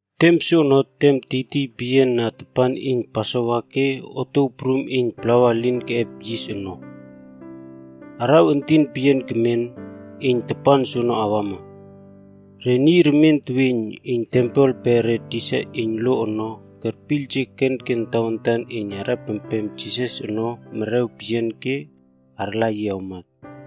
Tem soono tem tiytiy peyian na tapan iyn Pasova ke Otuow Prum Iyn Plawa Elin Keꞌep Yis ono. Araw entin peyian kermen iyn tapan soono awama. Re niy remien teweiyn iyn tempel pe re tisa iyn lo ono kerpiyljek kenken tawantan iyn arꞌepempem Jisas ono merew peyian ke arla yi awmat.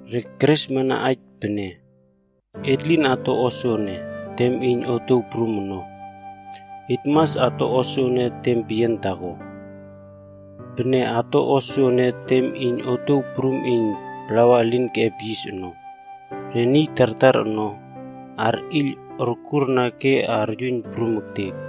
Re keresmana aij pene, “Et lin ato o soene tem iyn otuow prum ono. Et mas ato o soene tem peyian taako. Pene ato o soene tem iyn Otuow Prum Iyn Plawa Elin Keꞌep Yis ono, re niy tartar ono arꞌiyl okurna ke aryuiyn prum ektek.”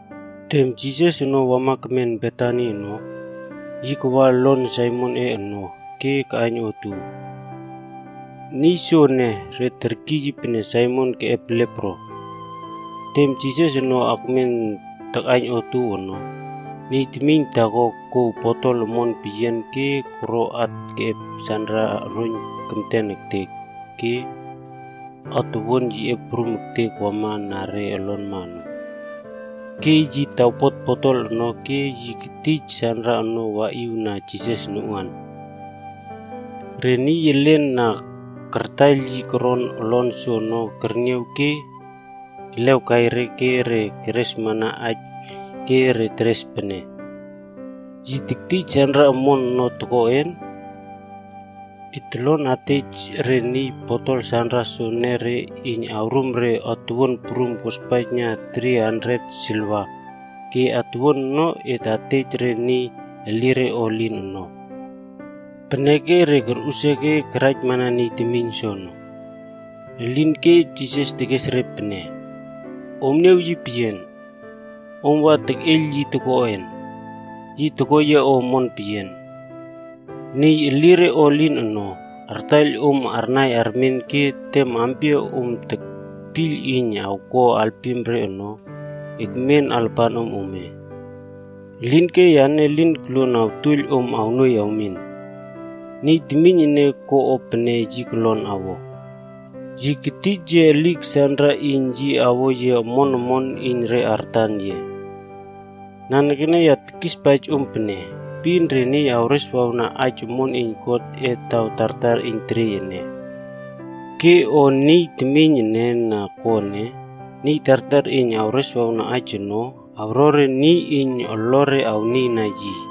Tem Jisas ono wa kemen Betani ono, yi kawa olon Saimonꞌe ono ke kaꞌaiyn otuow. Niy soene, re terkiy yi pene Saimon Keꞌep Lepro. Tem Jisas ono akmen takꞌaiyn otuow ono, niy temiyn taako kouw botol omon peyian re koro at keꞌep sanra oroiyn kemten ektek ke atowuan yiꞌe prum ektek wama na re olonma ono. Ke yi tawpot botol ono ke yi ketij sanra ono waꞌiw na Jisas noꞌuan. Re niy elen na kartaiyl re koron olon soono kerniaw ke elew kai re ke re keresmana aij ke re teres pene, “Yi tektij sanra omon ono toko en? Et tolon atej re niy botol sanra soene iyn re awrum et atuwuan prum kospaijna tri handet silivaa ke atuwuan ono et atej re niy elire o elin ono.” Peneke re korꞌusia ke karaijmana niy temiyn soono. Elinke Jisas tekes re pene, “Om niaw yi peyian. Om wa tekꞌeiyl yi toko en? Yi toko yia o omon peyian. Niy elire o elin ono, artaiyl om arnai armen ke tem ampia om tekpiyl iyn awko alpim re ono, ekmen alapanom ome. Elinke yane elin koluon awtuoiyl om awnuoiy awmin. Niy temiyn ene ko o pene yi kolon awo. Yi ketij yia elik sanra iyn yi awo yia omon omon iyn re artan yia. Nanekene ya tekispaij om pene, epin re niy awreswawna aij omon iyn Godꞌe taw tartar iyn teriey ene. Ke o niy temiyn ene na ko ene, niy tartar iyn awreswawna aij ono, awro re niy iyn olore arnieiyna yi.”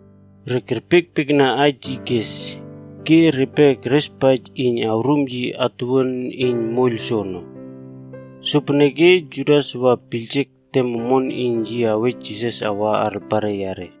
Re kerpiekpiekna aij yi kes ke repe kerespaij iyn awrum yi atuwuan iyn moiyl soono. Sopeneke Judas wa piyljek tem omon iyn yi awej Jisas awa alapare yare.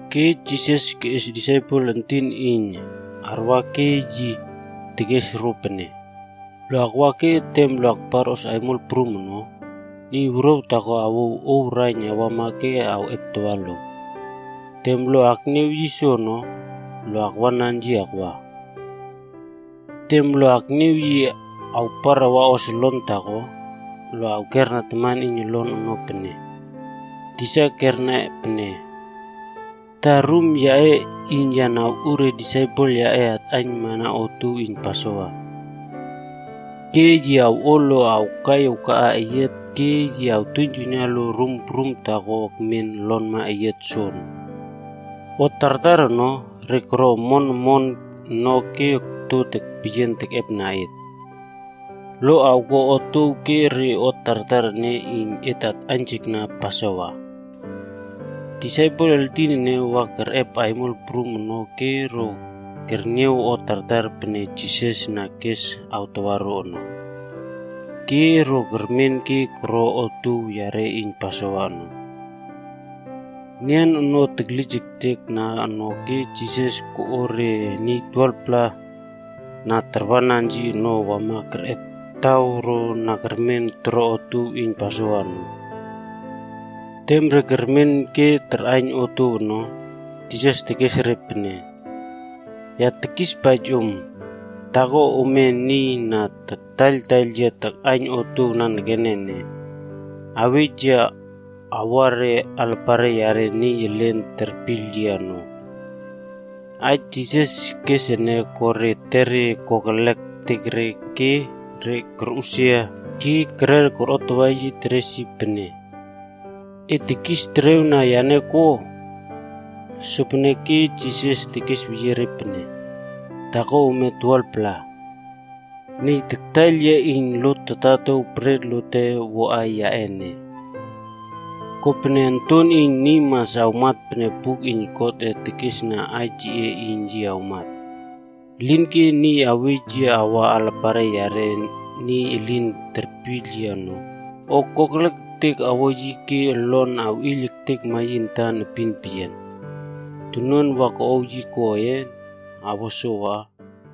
Ke Jisas keꞌes disaipel entin iyn arwa ke yi tekes ro pene, “Lo akwa ke tem lo akparꞌos aimol prum ono, niy wuruaw taako awouw ouw raiyn awama ke awꞌeptawa lo. Tem lo akniaw niy soono, lo akwanan yi akwa. Tem lo akniaw yi awpar awaꞌos olon taako, lo awkera taman iyn olon ono pene, ‘Tisa kerna pene, “Ta rum yaꞌe iyn ya awꞌu ke re disaipel yaꞌe atꞌaiynmana otuow iyn Pasova?” ’ Ke yi awꞌo lo awkai akaꞌa eyiat ke yi awtuiynjuiyna lo rum prum taako ekmen olonma eyiat soono. O tartar ono, re koro omon omon no ke okto peyian tekꞌepna et. Lo awko otuow ke re o tartar ene iyn et atꞌaiynjekna Pasova.” Disaipel eltin ene wa kerꞌep aimol prum ono ke ro kerniaw o tartar pene Jisas na kes awtawa ro ono. Ke ro kermen ke koro otuow yare iyn Pasova ono. Nian ono teklijektekna ono ke Jisas koꞌo re niy 12-pla na tarwanan yi ono wama kerꞌep taw ro na kermen toro otuow iyn Pasova ono. Tem re kermen ke tarꞌaiyn otuow ono, Jisas tekes re pene, “Ya tekispaij om, taako ome ene niy na taktaiyl yia takꞌaiyn otuow nanekene ene, awej yia awua alapare yare niy elin terpiyl yia ono.” Aij Jisas kes ene ko re etere kokelek ektek ke re korꞌusia ke kerer korꞌotawa yi teres yi pene, “E tekis terew na yane ko?” Sopeneke Jisas tekesweyie re pene, “Taako ome 12-pla. Niy taktaiyl yia iyn lot totatow bret lote woꞌai yaꞌe ene. Kopene Onton iyn Niy mas awmat pene buk iyn Godꞌe tekesna aij yiꞌe iyn yi awmat. Elinke niy awej yi awa alapare yare niy elin terpiyl yi ono, o kokelek ektek awo yi ke olon awꞌeiyl ektekma yi antan epin peyian. Tonuan wa koꞌow yi koꞌen? Awa sowa.”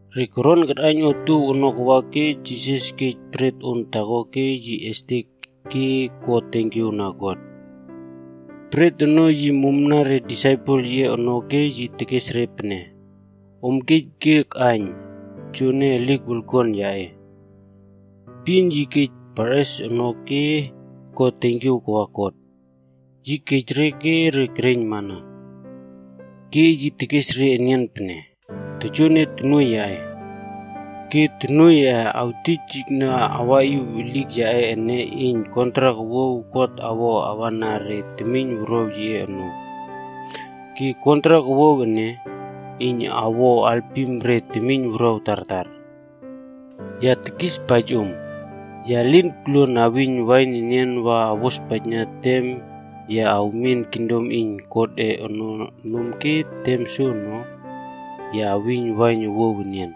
Re koron karꞌaiyn otuow ono kawa ke Jisas kej bret on taako ke yi estek ke ko tenkiaw na God. Bret ono yi mumna re disaipel yiꞌe ono ke yi tekes re pene, “Om kej ke akꞌaiyn. Joene elik wolkuan yaꞌe.” Epin yi kej parꞌes ono ke ko tenkiaw kawa God. Yi kej re ke re kereiyn mana. Ke yi tekes re enian pene, “Joene tonuoiy yaꞌe. Ke tonuoiy awtijijna awaꞌiw elik yaꞌe ene iyn kontrak owuaw God awo awana re temiynwuruaw yiꞌe ono. Ke kontrak owuaw ene, iyn awo alpim re temiynwuruaw tartar. Ya tekispaij om, ya lin koluon awiyn wain enian wa awospaijna tem ya awmin kingdom iyn Godꞌe ono nom ke tem soono, ya awiyn wain owuaw enian.”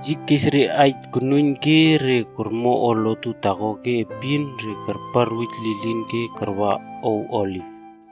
Yi kes re aij konuiyn ke re kormo o lotu taako ke epin re karparwuj lilin ke karwa Ow Oliv.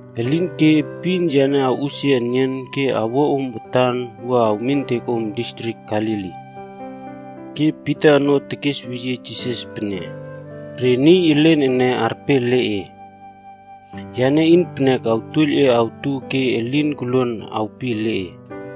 Elinke epin yane awꞌusia enian ke awua om watan wua awmintek om distrik Galili.” Ke Pita ono kesweyie Jisas pene, “Re niy elen ene arpe ele e. Yane iynpenek awtuoiyl e awtu ke elin koluon awpi ele e.”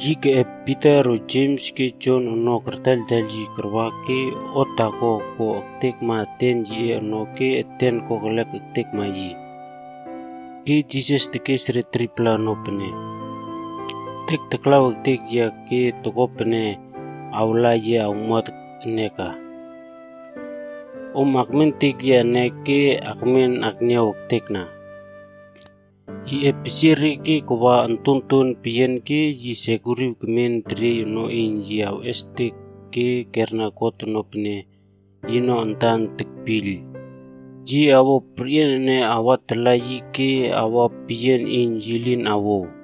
Yi keꞌep Pita ro Jems ke Jon ono kartaiyltaiyl yi karwa ke o taako koꞌa ektekma eten yiꞌe ono ke eten kokelek ektekma yi. Ke Jisas tekes re 3-pla ono pene, “Etek taklaw ektek yia ke toko pene awla yia awmuat ene ka. Om akmentek yia ene ke akmen akniaw ektekna.” Yi epesie re ke kawa ontonton peyian ke yi sekuriw kemen teriey ono iyn yi estek ke kerna God ono pene yino antan tekpiyl, yi awo perꞌian ene awatala yi ke awa peyian iyn yi lin awouw.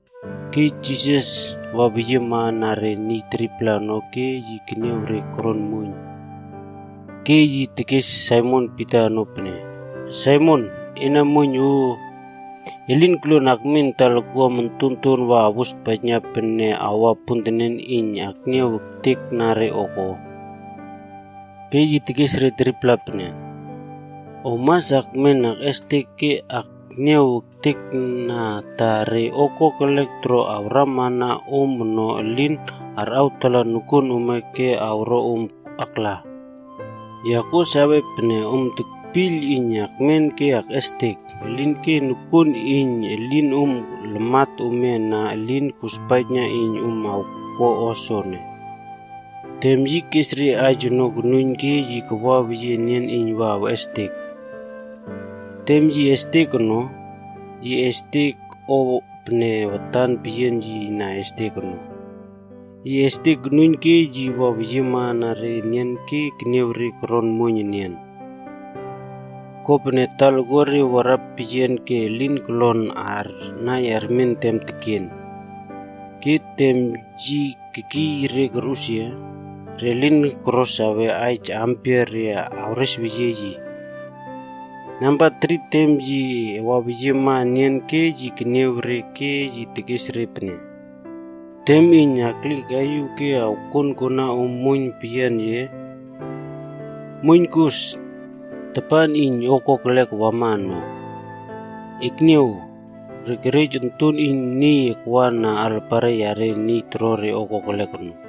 Ke Jisas waweyiema na re niy 3-pla ono ke yi keniaw re koron muoiyn. Ke yi tekes Saimon Pita ono pene, “Saimon, ena muoiyn o! E lin koluon akmin talakuam ontonton wa awospaijna pene aua pontenen iyn akniaw ektekna re o ko?” Ke yi tekes re 3-pla pene, “Om mas akmen akꞌestek ke akniaw ektekna ta re o kokelek toro awramana om ono elin arꞌawtala nokuon ome ke awro om akla. Ya kuo sawe pene om tekpiyl iyn akmen ke akꞌestek, elinke nokuon iyn elinom lamat ome ana elin kospaijna iyn om awko o soene.” Tem yi kes re aij ono konuiyn ke yi kawaweyie enian iyn wa estek. Tem yi estek ono, yi estek o pene watan peyian yi na estek ono. Yi estek konuiyn ke yi waweyiema na re enian ke keniaw re koron muoiyn enian. Kopene talakuare warapeyian ke elin kolon arnai armen tem tekena. Ke tem yi kekiy re korꞌusia, re lin koro sawe aij aampia re awresweyie yi. Namba tri tem yi waweyiema enian ke yi keniaw re ke yi tekes re pene, “Tem iyn alꞌieykaiꞌiw ke awkonkona om muoiyn peyian ye? Muoiyn kos! Tapan iyn o kokelek wama ono. Ekniaw, re kerej Onton iyn Niy akwa na alapare yare niy toro re o kokelek ono.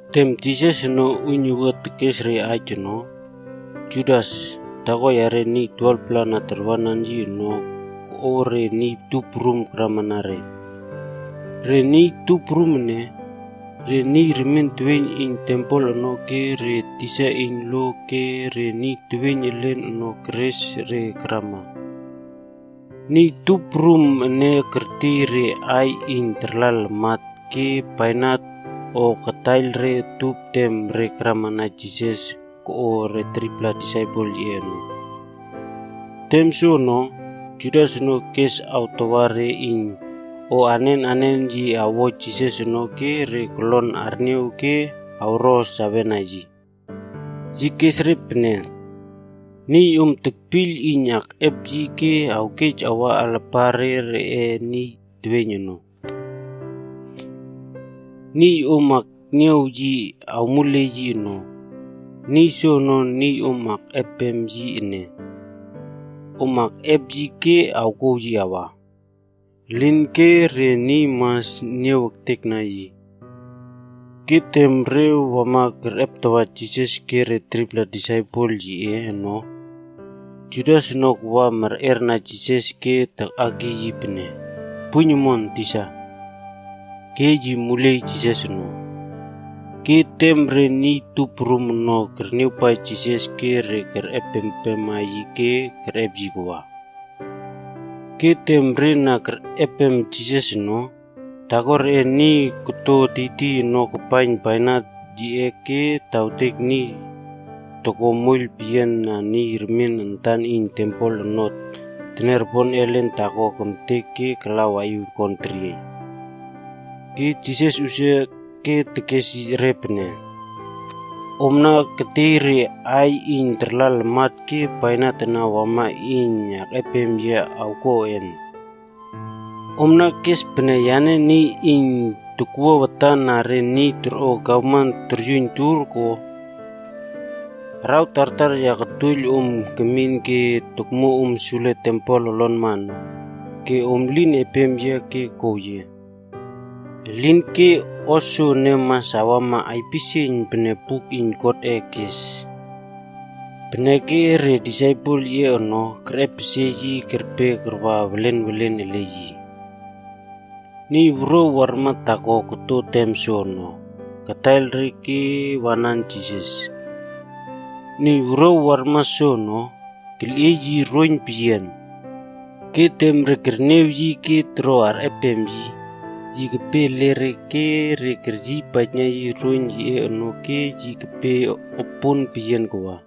Tem Jisas ono uiynuwua tekes re aij ono, Judas, taako yare niy 12-pla na tarwanan yi ono koꞌo re niy tup prum karamana re. Re niy tup prum ene, re niy remien teweiyn iyn tempel ono ke re tisa iyn lo ke re niy teweiyn elen ono keres re karama. Niy tup prum ene kertiey re aiy iyn tarla lamat ke bainat o kataiyl re utup tem re karamana Jisas koꞌo re 3-pla disaipel yiꞌe ono. Tem soono, Judas ono kes awtawa re iyn o anen anenre yi awo Jisas ono ke re kolon arniaw ke awro sawena yi. Yi kes re pene, “Niy om tekpiyl iyn akꞌep yi ke awkej awa alapare reꞌe niy teweiyn ono. Niy om akniaw yia awmuley yi ono, niy soono niy om akꞌepem yi ene. Om akꞌep yi ke awkouw yi awa. Elinke re niy mas niaw ektekna yi.” Ke tem re wama kerꞌeptawa Jisas ke re 3-pla disaipel yiꞌe ono, Judas ono kawa merꞌerna Jisas ke takꞌakiy yi pene, “Puiyn omon, tisa!” ke yi muliey Jisas ono. Ke tem re niy tup prum ono kerniawpaij Jisas ke re kerꞌep empema yi ke kerꞌep yi kawa. Ke tem re na kerꞌep Jisas ono, taako reꞌe niy korto tiytiy ono kapaiyn bainat yiꞌe ke tawtek niy toko moiyl peyian na niy remien antan iyn tempel ono teniaropon ellen taako kemtek ke kala waꞌiw kon teriey. Ke Jisas usia ke tekes re pene, “Omna ketiey re aiy iyn tarla lamat ke bainat ana wama iyn akꞌepem yia awkoꞌen? Omna kes pene yane niy iyn tokwua watan na re niy torꞌo gavman toryuiyn tur, ko? Araw tartar ya kotuoiyl om kemin ke tokmuo om sule tempel olonma ono, ke om lin epem yia ke kow yia. Elinke o soene mas awama aipisieiyn pene buk iyn Godꞌe kes.” Peneke re disaipel yiꞌe ono kerꞌepesie yi kerpe karwa welenwelen ele yi. Niy wuruaw warma taako koto tem soono, kataiyl re ke wanan Jisas. Niy wuruaw warma soono, kelꞌiey yi roiyn peyian. Ke tem re kerniaw yi ke toro arꞌepem yi, yi kepe ele re ke re keryiypaijna yi roiyn yiꞌe ono ke yi kepe opon peyian kawa.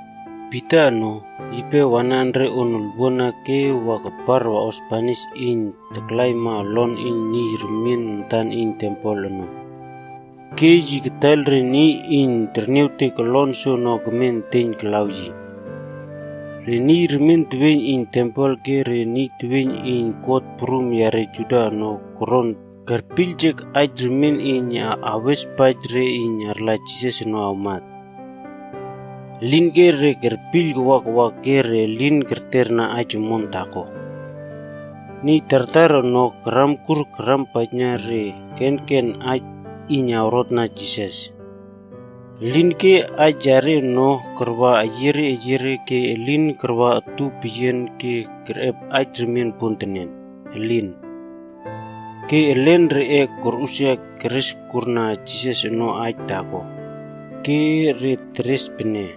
Pita ono, yipe wanan re on olwuana ke wa kapar waꞌos banis iyn taklaima olon iyn niy remien antan iyn tempel ono. Ke yi kataiyl re niy iyn terniawtek olon soono kemen eteiyn kalaw yi. Re niy remien teweiyn iyn tempel ke re niy teweiyn iyn kot prum yare Juda ono koron kerpiyljek aij remien iyn awespaij re iyn arla Jisas ono awmat. Elinke re kerpiyl kawa kawa ke re lin kerterna aij omon taako. Niy tartar ono karamkur karampaijna re kenken aij iyn awrotna Jisas. Elinke aij yare ono karwa eyiere eyiere ke elin karwa utup peyian ke kerꞌep aij remien pontenen. Elin. Ke elen reꞌe korꞌusia kereskurna Jisas ono aij taako. Ke re teres pene,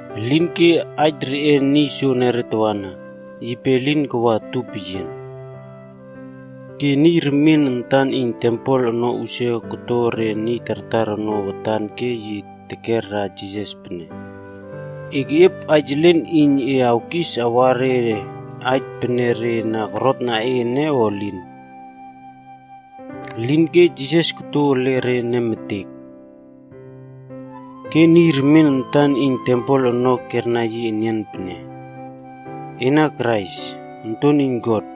Elinke aij reꞌe niy soenere tawana, yipe elin karwa utupeyian. Ke niy remien antan iyn tempel ono usia koto re niy tartar ono watan ke yi tekera Jisas pene, “E keꞌiep aij elen iyn e awkis awana re aij pene re na korotna e ene o elin?” Elinke Jisas koto ele re nemetek. Ke niy remien antan iyn tempel ono kerna yi enian pene, “Ena Krais, Onton iyn God,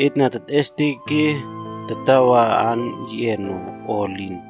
et na tetꞌestek ke tatawa aan yiꞌe ono, o elin?”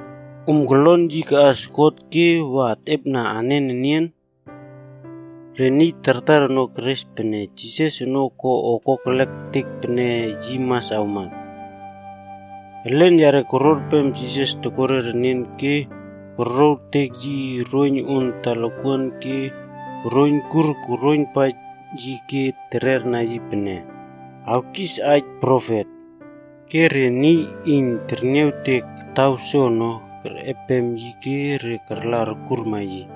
Om kolon yi kaꞌas God ke wa atꞌepna anen enian?” Re niy tartar ono keres pene Jisas ono ko o kokelek ektek peneke yi mas awmat. Elen yare kororpem Jisas tokore renen ke korlowtek yi roiyn on talakuan ke koroiynkur koroiynpaij yi ke tererna yi pene, “Awkis aij profet!” Ke re niy iyn terniawtek taw soono kerꞌepem yi ke re karla orkurma yi.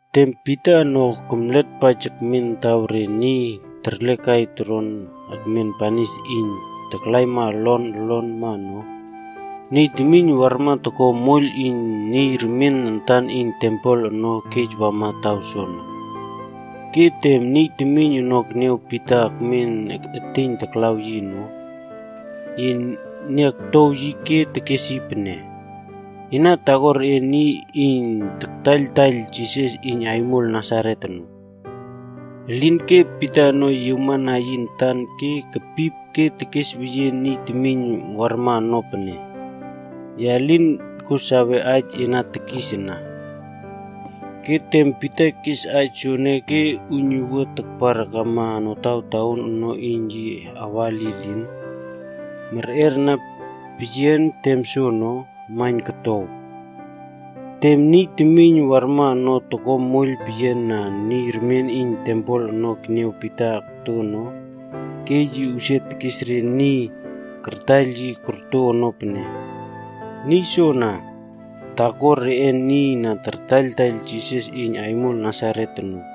Tem Pita ono kemletpaij akmen taw re niy terlekai toron akmen banis iyn taklaima olon olonma ono, niy temiyn warma toko moiyl iyn niy remien antan iyn tempel ono kej wama taw soono. Ke tem niy temiyn ono keniaw Pita akmen eteiyn taklaw yi ono, yi niaoktow yi ke tekes yi pene, “Ena taako reꞌe niy iyn taktaiyltaiyl Jisas iyn aimol Nasaret ono.” Elinke Pita ono yiawmana yi antan ke kepip ke tekesweyie niy temiyn warma ono pene, “Ya lin sawe aij e na tekis ana.” Ke tem Pita kes aij soene ke uiynuwua takpar akama notawtaon ono iyn yi awa lilin, merꞌerna peyian tem soono, maiyn kotow. Tem niy temiyn warma na toko moiyl peyian na niy remien iyn tempel ono keniaw Pita akto ono, ke yi usia tekes re niy kartaiyl yi korto ono pene, “Niy soana, taako reꞌe niy na tartaiyltaiyl Jisas iyn aimol Nasaret ono.”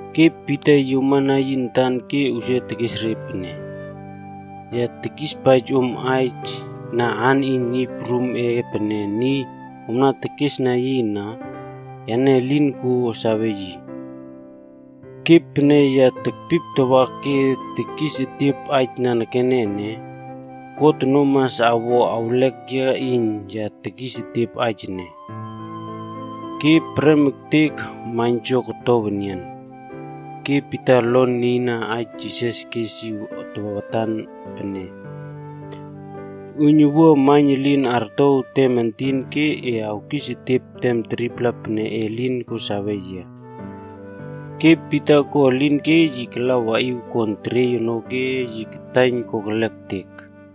Ke Pita yiawmana yi antan ke usia tekes re pene, “Ya tekispaij om na aan iyn Niy Prumꞌe pene niy omna tekesna yi ana, yane elin kuo sawe yi. Ke pene ya tekpiptawa ke tekis etiep aij nanekene ene, God ono mas awo awlek yia iyn ya tekis etiep aij ene.” Ke prem ektek maiynjo kotow enian, ke Pita olon nieiyna aij Jisas kes yi watan pene, “Uiynuwua maiyn elin artow tem entin ke e awkisetiep tem 3-pla pene e lin ko sawe yia.” Ke Pita ko elin ke yi kala waꞌiw kon teriey ono ke yi kataiyn kokelek ektek.